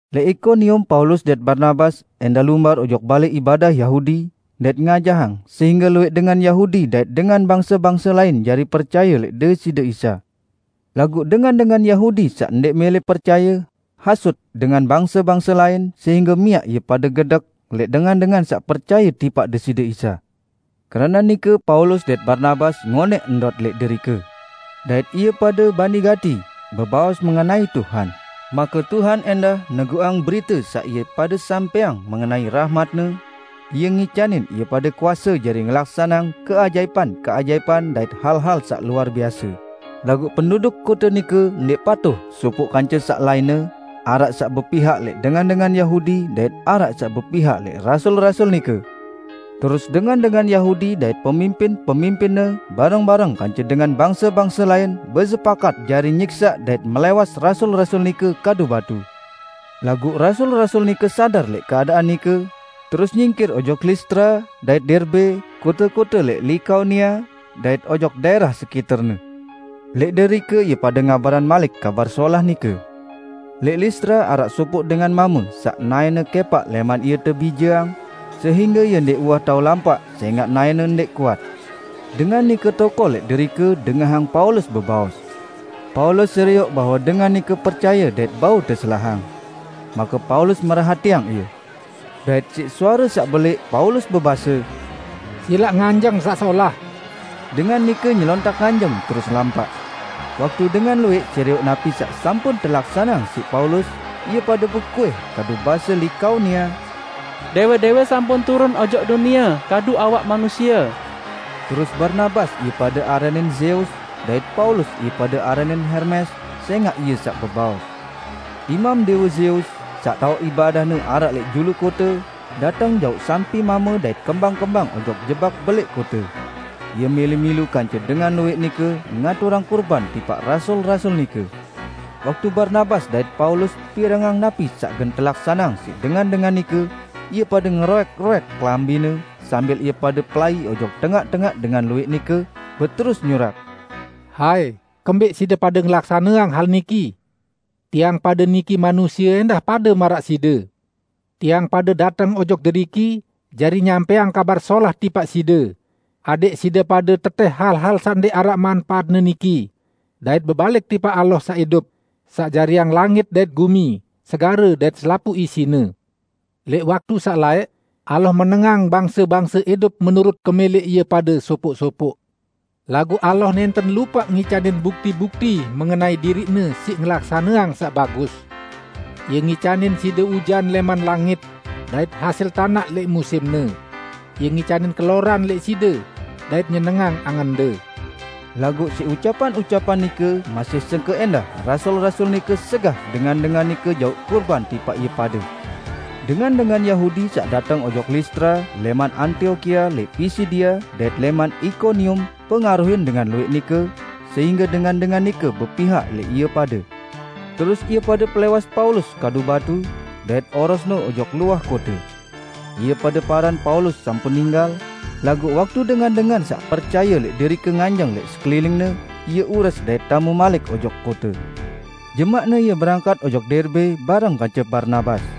Lẽq Ikonium Paulus dait Barnabas ẽndah lumbar ojok balẽ ibadah Yahudi, dait ngajahang sehingge luwẽq dengan Yahudi dait dengan bangse-bangse lain jari percaye lẽq Deside Isa. Laguq dengan-dengan Yahudi saq ndẽq mẽlẽ percaye, hasut dengan bangse-bangse lain, sehingge miaq ie pade gedek lẽq dengan-dengan saq percaye tipaq Deside Isa. Keranaq nike Paulus dait Barnabas ngonẽq ndot lẽq derike. Dait ie pade bani gati bebaos mengenai Tuhan. Make Ie ẽndah neguqang berite saq ie pade sampẽang mengenai rahmat-Ne, Ie ngicanin ie pade kuase jari ngelaksaneang keajaipan-keajaipan dait hal-hal saq luar biase. Laguq penduduk kote nike ndẽq patuh sopoq kance saq lainne; araq saq bepihak lẽq dengan-dengan Yahudi dait araq saq bepihak lẽq rasul-rasul nike. Terus dengan-dengan Yahudi dait pemimpin-pemimpinne bareng-bareng kance dengan bangse-bangse lain besepakat jari nyiksaq dait melẽwas rasul-rasul nike kadu batu. Laguq rasul-rasul nike sadar lẽq keadaan nike, terus nyingkir ojok Listra dait Derbe, kote-kote lẽq Likaonia, dait ojok daẽrah sekiterne. Lẽq derike ie pade ngabarang malik Kabar Solah nike. Lẽq Listra araq sopoq dengan mame saq naẽne kẽpaq lẽman ie tebijeang, sehingge ie ndẽq uwah tao lampaq sẽngaq naẽne ndẽq kuat. Dengan nike tokol lẽq derike dengahang Paulus bebaos. Paulus serioq bahwe dengan nike percaye dait bau teselahang. Make Paulus merhatiang ie. Dait siq suare saq belẽq Paulus bebase, "Silaq nganjeng saq solah!" Dengan nike nyelontak nganjeng terus lampaq. Waktu dengan luwẽq serioq napi saq sampun telaksaneang siq Paulus, ie pade bekuih kadu base Likaonia, "Dẽwe-dẽwe sampun turun ojok dunie kadu awak manusie." Terus Barnabas ie pade aranin Zeus, dait Paulus ie pade aranin Hermes, sẽngaq ie saq bebaos. Imam dẽwe Zeus, saq taoq ibadahne araq lẽq julu kote, dateng jauq sampi mame dait kembang-kembang ojok jebak belẽq kote. Ie mẽlẽ milu kance dengan luwẽq nike ngaturang kurban tipaq rasul-rasul nike. Waktu Barnabas dait Paulus pirengang napi saq gen telaksaneang siq dengan-dengan nike, ie pade ngeroẽk-roẽk kelambine sambil ie pade pelai ojok tengaq-tengaq dengan luwẽq nike, beterus nyurak, "Hai, kembẽq side pade ngelaksaneang hal niki? Tiang pade niki manusie ẽndah pade maraq side! Tiang pade dateng ojok deriki jari nyampẽang Kabar Solah tipaq side, adẽq side pade tetẽh hal-hal saq ndẽq araq manpaatne niki, dait bebalik tipaq Allah saq idup, saq jariang langit dait gumi, segare dait selapuq isine. Lẽq waktu saq laẽq Allah menengang bangse-bangse idup menurut kemẽlẽq ie pade sopoq-sopoq. Laguq Allah nẽnten lupaq ngicanin bukti-bukti mengenai diriq-Ne siq ngelaksaneang saq bagus. Ie ngicanin side ujan lẽman langit dait hasil tanaq lẽq musimne. Ie ngicanin keloran lẽq side dait nyenengang angende." Laguq siq ucapan-ucapan nike masih sengke ẽndah rasul-rasul nike segah dengan-dengan nike jauq kurban tipaq ie pade. Dengan-dengan Yahudi saq dateng ojok Listra lẽman Antiokia lẽq Pisidia dait lẽman Ikonium pengaruhin dengan luwẽq nike sehingge dengan-dengan nike bepihak lẽq ie pade. Terus ie pade pelẽwas Paulus kadu batu, dait orosne ojok luah kote. Ie pade paran Paulus sampun ninggal, laguq waktu dengan-dengan saq percaye lẽq derike nganjeng lẽq sekeliningne, ie ures dait tame malik ojok kote. Jemaqne ie berangkat ojok Derbe bareng kance Barnabas.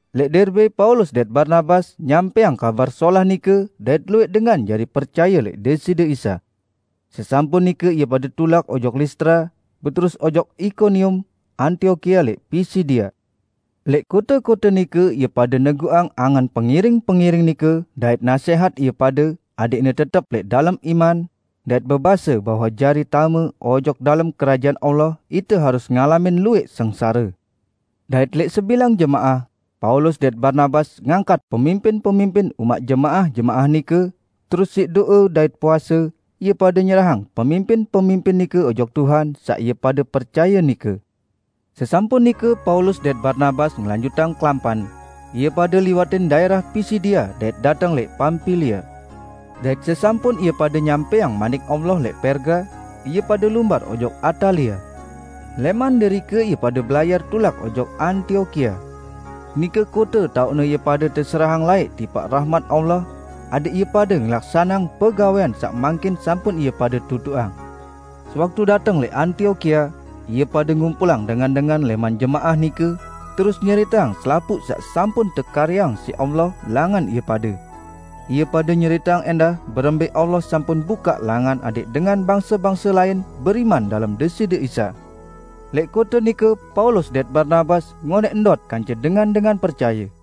Lẽq Derbe Paulus dait Barnabas nyampẽang Kabar Solah nike dait luwẽq dengan jari percaye lẽq Deside Isa. Sesampun nike ie pade tulak ojok Listra, beterus ojok Ikonium, Antiokia lẽq Pisidia. Lẽq kote-kote nike ie pade neguqang angen pengiring-pengiring nike dait nasẽhat ie pade adẽqne tetep lẽq dalem iman, dait bebase bahwe jari tame ojok dalem Kerajaan Allah ite harus ngalamin luwẽq sengsare. Dait lẽq sebilang jemaah, Paulus dait Barnabas ngangkat pemimpin-pemimpin umaq jemaah-jemaah nike, terus siq do'e dait puase, ie pade nyerahang pemimpin-pemimpin nike ojok Tuhan saq ie pade percaye nike. Sesampun nike Paulus dait Barnabas ngelanjutang kelampan ie pade liwatin daẽrah Pisidia dait dateng lẽq Pampilia. Dait sesampun ie pade nyampẽang Manik Allah lẽq Perga, ie pade lumbar ojok Atalia. Lẽman derike ie pade belayar tulak ojok Antiokia. Nike kote taoqne ie pade teserahang laẽq tipaq rahmat Allah, adẽq ie pade ngelaksaneang pegawẽan saq mangkin sampun ie pade tutuqang. Sewaktu dateng lẽq Antiokia, ie pade ngumpulang dengan-dengan lẽman jemaah nike, terus nyeriteang selapuq saq sampun tekaryeang siq Allah langan ie pade. Ie pade nyeriteang ẽndah berembẽ Allah sampun bukaq langan adẽq dengan bangse-bangse lain beriman dalem Deside Isa. Lẽq kote nike Paulus dait Barnabas ngonẽq ndot kance dengan-dengan percaye.